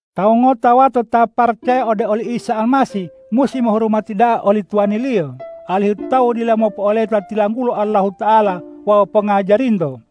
Tawu ngota wato ta paracaya ode oli Isa Almasih musi mohurumati da'a oli tuwaniliyo, alihu tawu dila mopo'oleta tilanggulo Allahuta'ala wawu pongajarinto.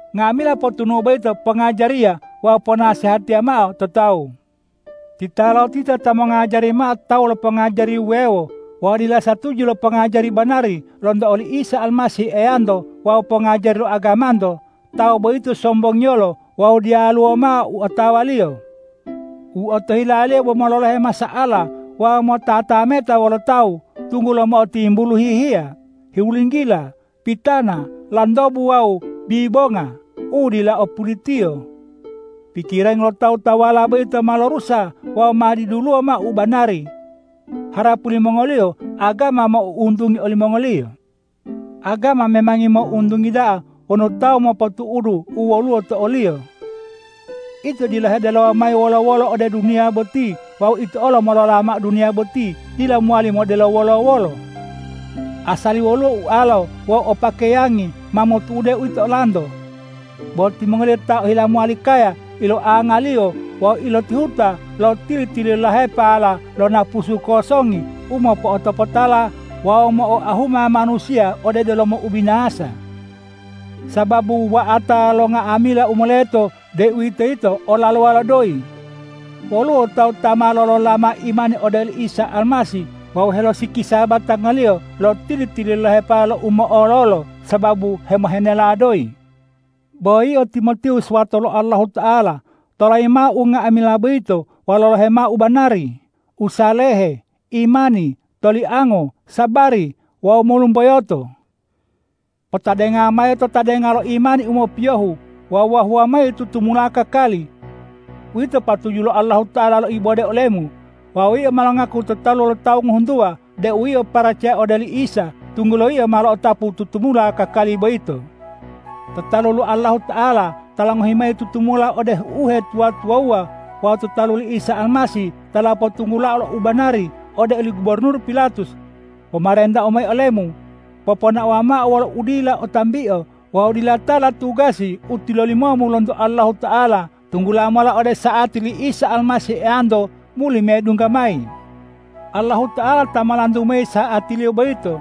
Nga'amila potunu'u boyito pongajariya wawu ponasehatiya mao to tawu. Titalotita ta mongajari mao tawu lo pongajari wuwewo wawu dila satuju lo pongajari banari lonto oli Isa Almasih Eyanto wawu pongajari lo agamanto, tawu boyito sombongiyolo wawu diyaluwo mao u otawaliyo. U otohilaliyo bo mololohe masa'ala wawu motatameta wolo tawu, tunggulo mo'otimbulu hihiya, hulinggila, pitana, lantobu wawu bibonga u dila o pulitiyo. Pikirangi lo tawu-tawuwala boyito ma lorusa wawu ma diduluwo mao u banari. Harapu limongoliyo agama mo'ountungi olimongoliyo. Agama memangi mo'ountungi da'a wonu tawu mopotu'udu u woluwo to oliyo. Ito dila hedelowa mayi wolo-wolo ode duniya boti wawu ito olo molola mao duniya boti dila mowali modelo wolo-wolo. Asali woluwo ualolo wawu o pakeyangi, ma motu'ude uwito olanto. Bo timongoliyo ta ohila mowali kaya iloangaliyo wawu ilotihuta lo tili-tililahepala lo napusu kosongi u mo'otopotala wawu mo'oahuma manusiya ode delomo ubinasa. Sababu wuwa'ata lo nga'amila u moleto, deuwitoyito olalowa lo doyi. Woluwo tawu ta ma lolola imani ode oli Isa Almasih wawu helosikisa batangaliyo lo tili-tililahepala lo u mo'ololo sababu hemohenela doyi. Bo yio Timotiwus wato lo Allahuta'ala, tolayi mao unga'amila boyito wawu lolohe mao ubanari, usalehe, imani, toliango, sabari wawu molumboyoto. Potadenga mayi to tadenga lo imani u mopiyohu wawu wahuwa mayi tutumula kakali. Uwito patuju lo Allahuta'ala loibode olemu. Wawu yio ma longaku to talu lo tawu ngohuntuwa deu yio paracaya ode oli Isa, tunggulo yio ma lo'otapu tutumula kakali boyito. To talu lo Allahuta'ala ta longohi mayi tutumula ode uhetuwa-tuwawuwa wawu to talu li Isa Almasih ta lopotunggulao lo u banari ode oli gubornur Pilatus, pomarentau mayi olemu: Poponaowa mao wolo udila o tambio wawu dila tala tugasi u tilolimomu lonto Allahuta'ala tunggula mola ode sa'ati li Isa Almasih Eyanto muli medungga mayi. Allahuta'ala ta molantu mayi sa'atiliyo boyito.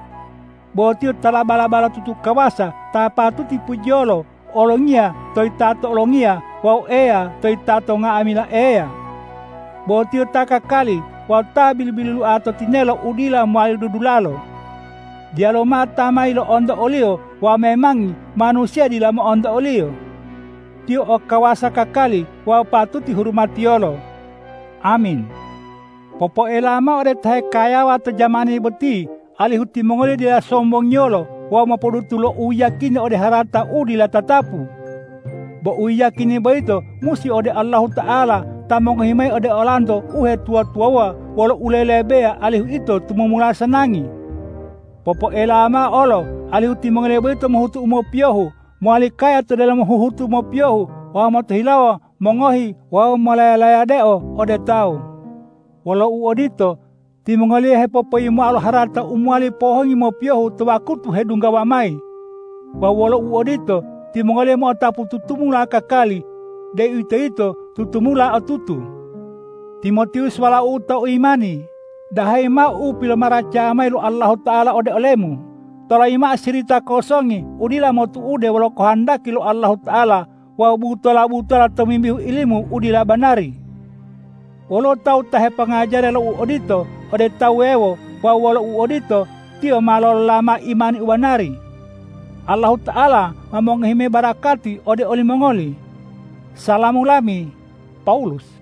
Bo Tiyo ta laba-labatutu kawasa, Ta patuti pujiyolo, Olongiya to yitato olongiya wawu Eya to yitato nga'amila eya. Bo Tiyo ta kakali wawu ta bilu-biluloa to tinelo u dila mowali dudulalo. Diyaluwo mao ta ma yilo'onto o-Liyo wawu memangi manusiya dila mo'onto o-Liyo. Tiyo o kawasa kakali wawu patuti hurumatiyolo! Amin. Popoelawa mao ode ta hekayawa to jamani boti, alihu timongoliyo dila sombongiyolo wawu mopodutu lo uyiyakini ode harata u dila tatapu. Bo uyiyakini boyito musi ode Allahuta'ala ta mongohi mayi ode olanto uhetuwa-tuwawuwa wolo ulelebeya alihu ito tumumula sanangi. Popoelawa mao olo alihu timongoliyo boyito mohutu u mopiyohu, mowali kaya to delomo huhutu mopiyohu wawu motohilawo mongohi wawu molaya-layadeo ode tawu. Wolo uodito, timongoliyo hepopoyimoa lo harata u mowali pohongi mopiyohu to wakutu hedunggawa mayi. Wawu wolo uodito, timongoliyo mo'otapu tutumula kakali, deuwitoyito tutumula otutu. Timotiwus walau'u to imani, dahayi mao u pilomaracaya mayi lo Allahuta'ala ode olemu. Tolayimu mao sirita kosongi u dila motu'ude wolo kohondaki lo Allahuta'ala wawu butola-butola tomimbihu ilimu u dila banari. Woluwo tawu ta hepongajariya lo u odito ode tawu wuwewo wawu wolo uodito, tiyo ma lolola mao imani u banari. Allahuta'ala ma mongohi mayi barakati ode olimongoli. Salamu lami, Pawulus